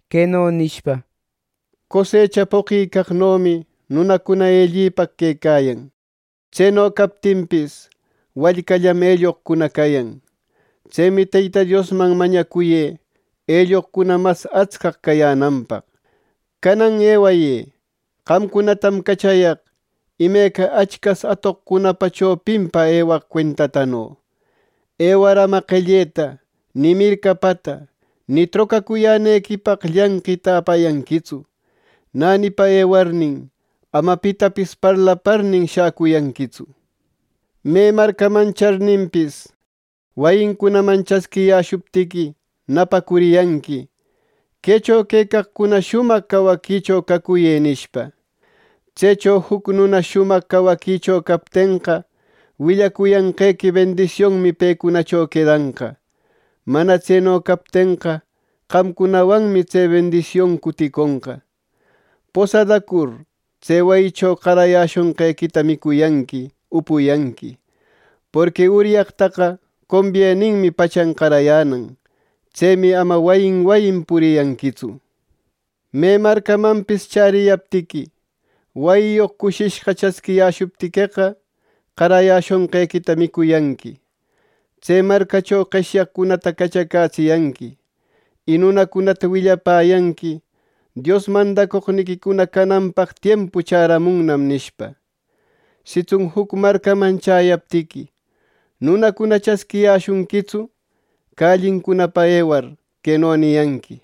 queno nishpa: —Cosecha poqicaqnomi nunacuna ellipaq quecayan. Tseno captinpis, wallcallam elloqcuna cayan. Tsemi Teyta Diosman mañacuyë elloqcuna mas atscaq cayänanpaq. Canan ewayë. Qamcunatam cachayaq imeca achcas atoqcunapa chopinpa ewaq cuentatano. Ewar ama qelleta ni mircapata ni trocacuyänequipaq llanqita apayanquitsu. Nänipa ewarnin, ama pitapis parlaparnin, shäcuyanquitsu. Me marcaman charninpis, wayincunaman chasquiyäshuptiqui, napacuriyanqui, ‘Quecho quecaqcuna shumaq cawaquicho cacuyë’ nishpa. Tsecho juc nuna shumaq cawaquicho captenqa, willacuyanqequi bendisionmi pecunacho quedanqa. Mana tseno captenqa, qamcunawanmi tse bendision cuticonqa. Posadacur, tse wayicho qarayäshonqequita micuyanqui upuyanqui, porqui uryaqtaqa combieninmi pachan qarayänan. Tsemi ama wayin wayin puriyanquitsu. Me marcamanpis chäriyaptiqui, wayiyoq cushishqa chasquiyäshuptiqueqa, qarayäshonqequita micuyanqui. Tse marcacho qeshyaqcunata cachacätsiyanqui. Y nunacunata willapäyanqui ‘Dios mandacoqniquicuna cananpaq tiempu chäramunnam’ nishpa. Sitsun juc marcaman chäyaptiqui, nunacuna chasquiyäshunquitsu, callincunapa ewar, queno niyanqui: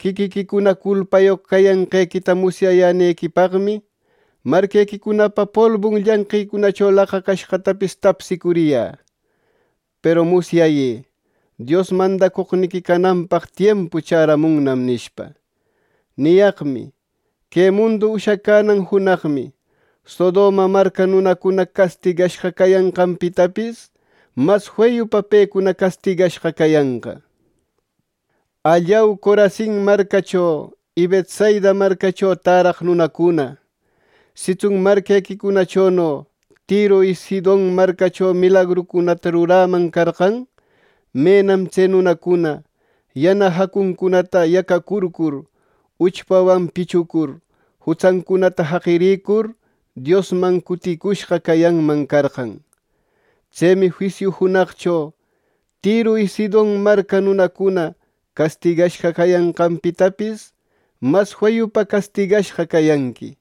‘Quiquiquicuna culpayoq cayanqequita musyayänequipaqmi, marquequicunapa polbun llanqïcunacho laqacashqatapis tapsicuriyä. Peru musyayë: Dios mandacoqniquicuna cananpaq tiempu chäramunnam’ nishpa. Niyaqmi, que mundu ushacänan junaqmi, Sodoma marca nunacuna castigashqa cayanqanpitapis mas feyupa pecuna castigashqa cayanqa. “¡Allau, Corasin marcacho y Betsaida marcacho täraq nunacuna! Sitsun marquequicunachono Tiro y Sidon marcacho milagrucunata ruräman carqan; menam tse nunacuna yana jacuncunata yacacurcur, uchpawan pichucur, jutsancunata jaqirïcur Diosman cuticushqa cayanman carqan. Tsemi juisiu junaqcho Tiro y Sidon marca nunacuna castigashqa cayanqanpitapis, mas feyupa castigashqa cayanqui.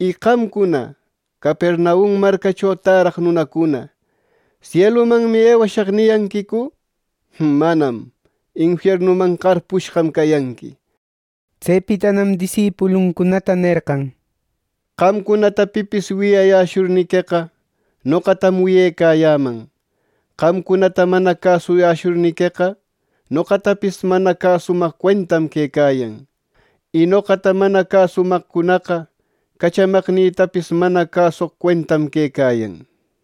Y qamcuna, Capernaum marcacho täraq nunacuna, ‘Sielumanmi ewayäshaq’ ¿niyanquicu? ¡Manam, infiernuman qarpushqam cayanqui!” Tsepitanam disipuluncunata nerqan: —Qamcunata pipis wiyayäshurniqueqa, noqatam wiyecayäman. Qamcunata mana cäsuyäshurniqueqa, noqatapis mana cäsumaq cuentam quecayan, y noqata mana cäsumaqcunaqa, cachamaqnïtapis mana cäsoq cuentam quecayan —nir.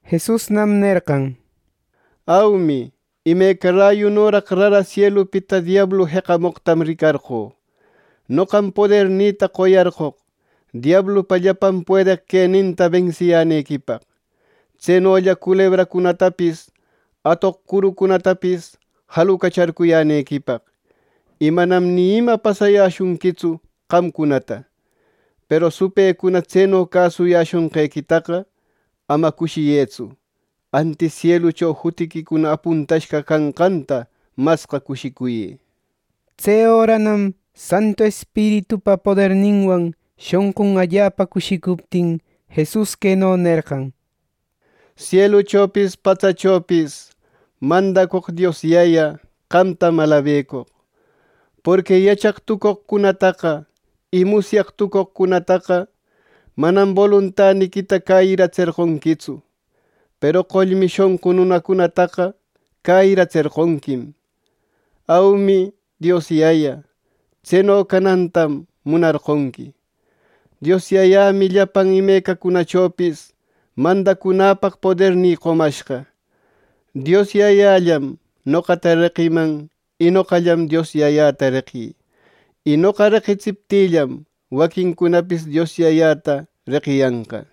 Jesusnam nerqan: —Aumi, imeca rayunoraq rara sielupita diablu jeqamoqtam ricarqö. Noqam podernïta qoyarqoq diablupa llapan puedeq queninta bensiyänequipaq, tsenolla culebracunatapis, atoq curucunatapis jalucacharcuyänequipaq; y manam ni ima pasayäshunquitsu qamcunata. Peru supëcuna tseno cäsuyäshonqequitaqa, ama cushiyëtsu; antis sielucho jutiquicuna apuntashqa canqanta masqa cushicuyë. Tse öranam Santu Espiritupa poderninwan shonqun allapa cushicuptin, Jesus queno nerqan: —Sieluchopis patsachopis mandacoq Dios Yaya, qamtam alabecoq. Porqui yachaq tucoqcunataqa y musyaq tucoqcunataqa manam boluntaniquita cäyiratserqonquitsu; peru qollmi shonqu nunacunataqa cäyiratserqonquim. Aumi, Dios Yaya, tseno canantam munarqonqui. “Dios Yayämi llapan imecacunachopis mandacunäpaq podernï qomashqa. Dios Yayallam noqata reqiman, y noqallam Dios Yayäta reqï y noqa reqitsiptïllam waquincunapis Dios Yayata reqiyanqa.”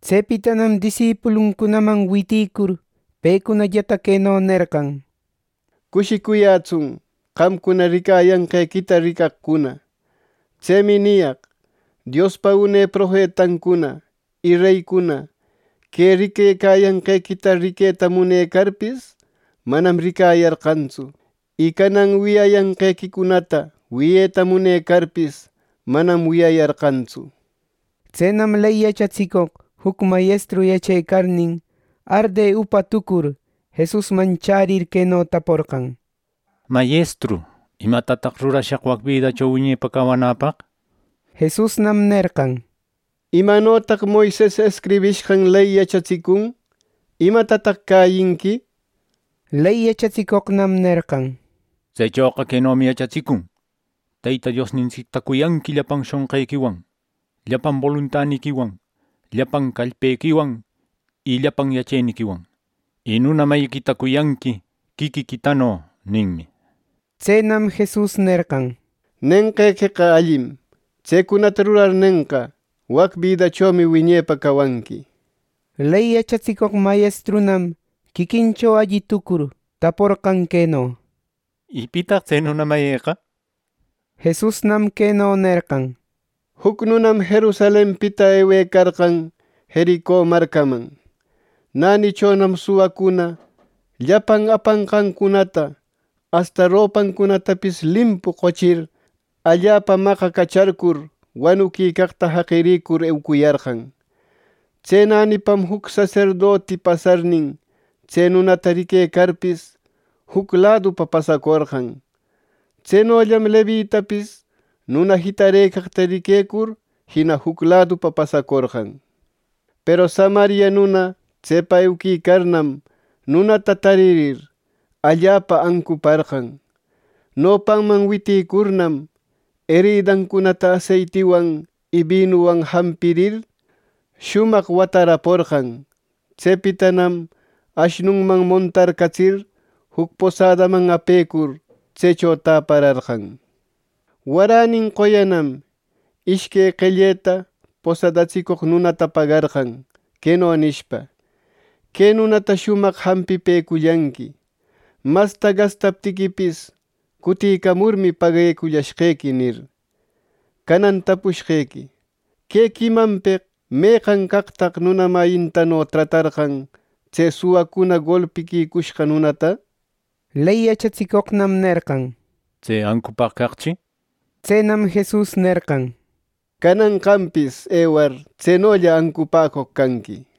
Tsepitanam disipuluncunaman witïcur, pecunallata queno nerqan: —Cushicuyätsun qamcuna ricayanqequita ricaqcuna. Tsemi niyaq: Diospa une profetancuna y reycuna que ricayanqequicunata riqueta munecarpis, manam ricayarqantsu; y canan wiyayanqequicunata wiyeta munecarpis, manam wiyayarqantsu. Tsenam ley yachatsicoq juc mayestru yachecarnin, arde upa tucur, Jesusman chärir queno taporqan: —Mayestru, ¿imatataq rurashaq wac bidacho wiñepa cawanäpaq? —nir. Jesusnam nerqan: —¿Imanotaq Moises escribishqan ley yachatsicun? ¿Imatataq cäyinqui? Ley yachatsicoqnam nerqan: —Tsechoqa quenomi yachatsicun: ‘Teyta Diosniquita cuyanqui llapan shonqiquiwan, llapan boluntaniquiwan, llapan callpequiwan, y llapan yacheniquiwan. Y nuna mayiquita cuyanqui quiquiquitano’ ninmi, nir. Tsenam Jesus nerqan: —Nenqequeqa allim. Tsecunata rurarnenqa, wac bidachomi wiñepa cawanqui. Ley yachatsicoq mayestrunam quiquincho alli tucur, taporqan queno: —¿Pitaq tse nuna mayïqa? —nir. Jesusnam queno nerqan: —Juc nunam Jerusalenpita ewecarqan Jerico marcaman. Nänichonam suwacuna llapan apanqancunata asta ropancunatapis limpu qochir, allapa maqacacharcur, wanuquicaqta jaqirïcur, eucuyarqan. Tse nänipam juc saserdoti pasarnin, tse nunata riquecarpis, juc ladupa pasacorqan. Tsenollam Levitapis nuna jitarëcaqta riquecur, jina juc ladupa pasacorqan. Peru Samaria nuna tsepa euquicarnam, nunata taririr, allapa ancuparqan. Nopanman witicurnam, eridancunata aseitiwan y binuwan jampirir, shumaq wataraporqan. Tsepitanam ashnunman montarcatsir, juc posadaman apecur, tsecho täpararqan. Waränin qoyanam ishque qelleta posadatsicoq nunata pagarqan, queno nishpa: ‘Que nunata shumaq jampipecullanqui. Masta gastaptiquipis, cutïcamurmi paguecullashqequi’ —nir. ‘Canan tapushqequi: Que quimanpeq ¿meqan caqtaq nuna mayintano tratarqan tse suwacuna golpiquicushqa nunata?’ Ley yachatsicoqnam nerqan: —Tse ancupaq caqchi —nir. Tsenam Jesus nerqan: —Canan qampis ewar, tsenolla ancupäcoq canqui —nir.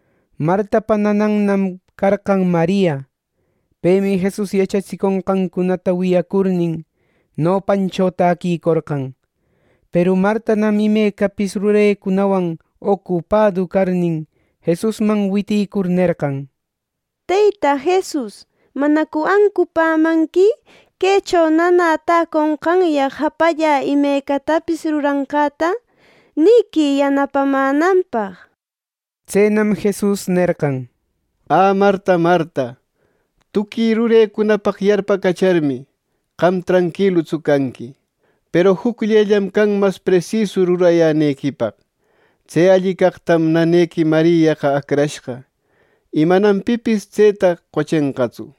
Martapa nananmi carqan Maria. Pemi Jesus yachatsiconqancunata wiyacurnin, nopancho täquicorqan. Peru Martanam imecapis rurecunawan ocupadu carnin, Jesusman witicur nerqan: —Teyta Jesus, ¿manacu ancupämanqui quecho nanä täconqanyaq japallä imecatapis ruranqäta? ¡Nïquï yanapamänanpaq! Tsenam Jesus nerqan: —Ä Marta, Marta. Tuqui rurecunapaq yarpacacharmi, qam tranquilutsu canqui. Peru jucllellam can mas presisu rurayänequipaq. Tse alli caqtam nanequi Mariaqa acrashqa, y manam pipis tseta qochenqatsu.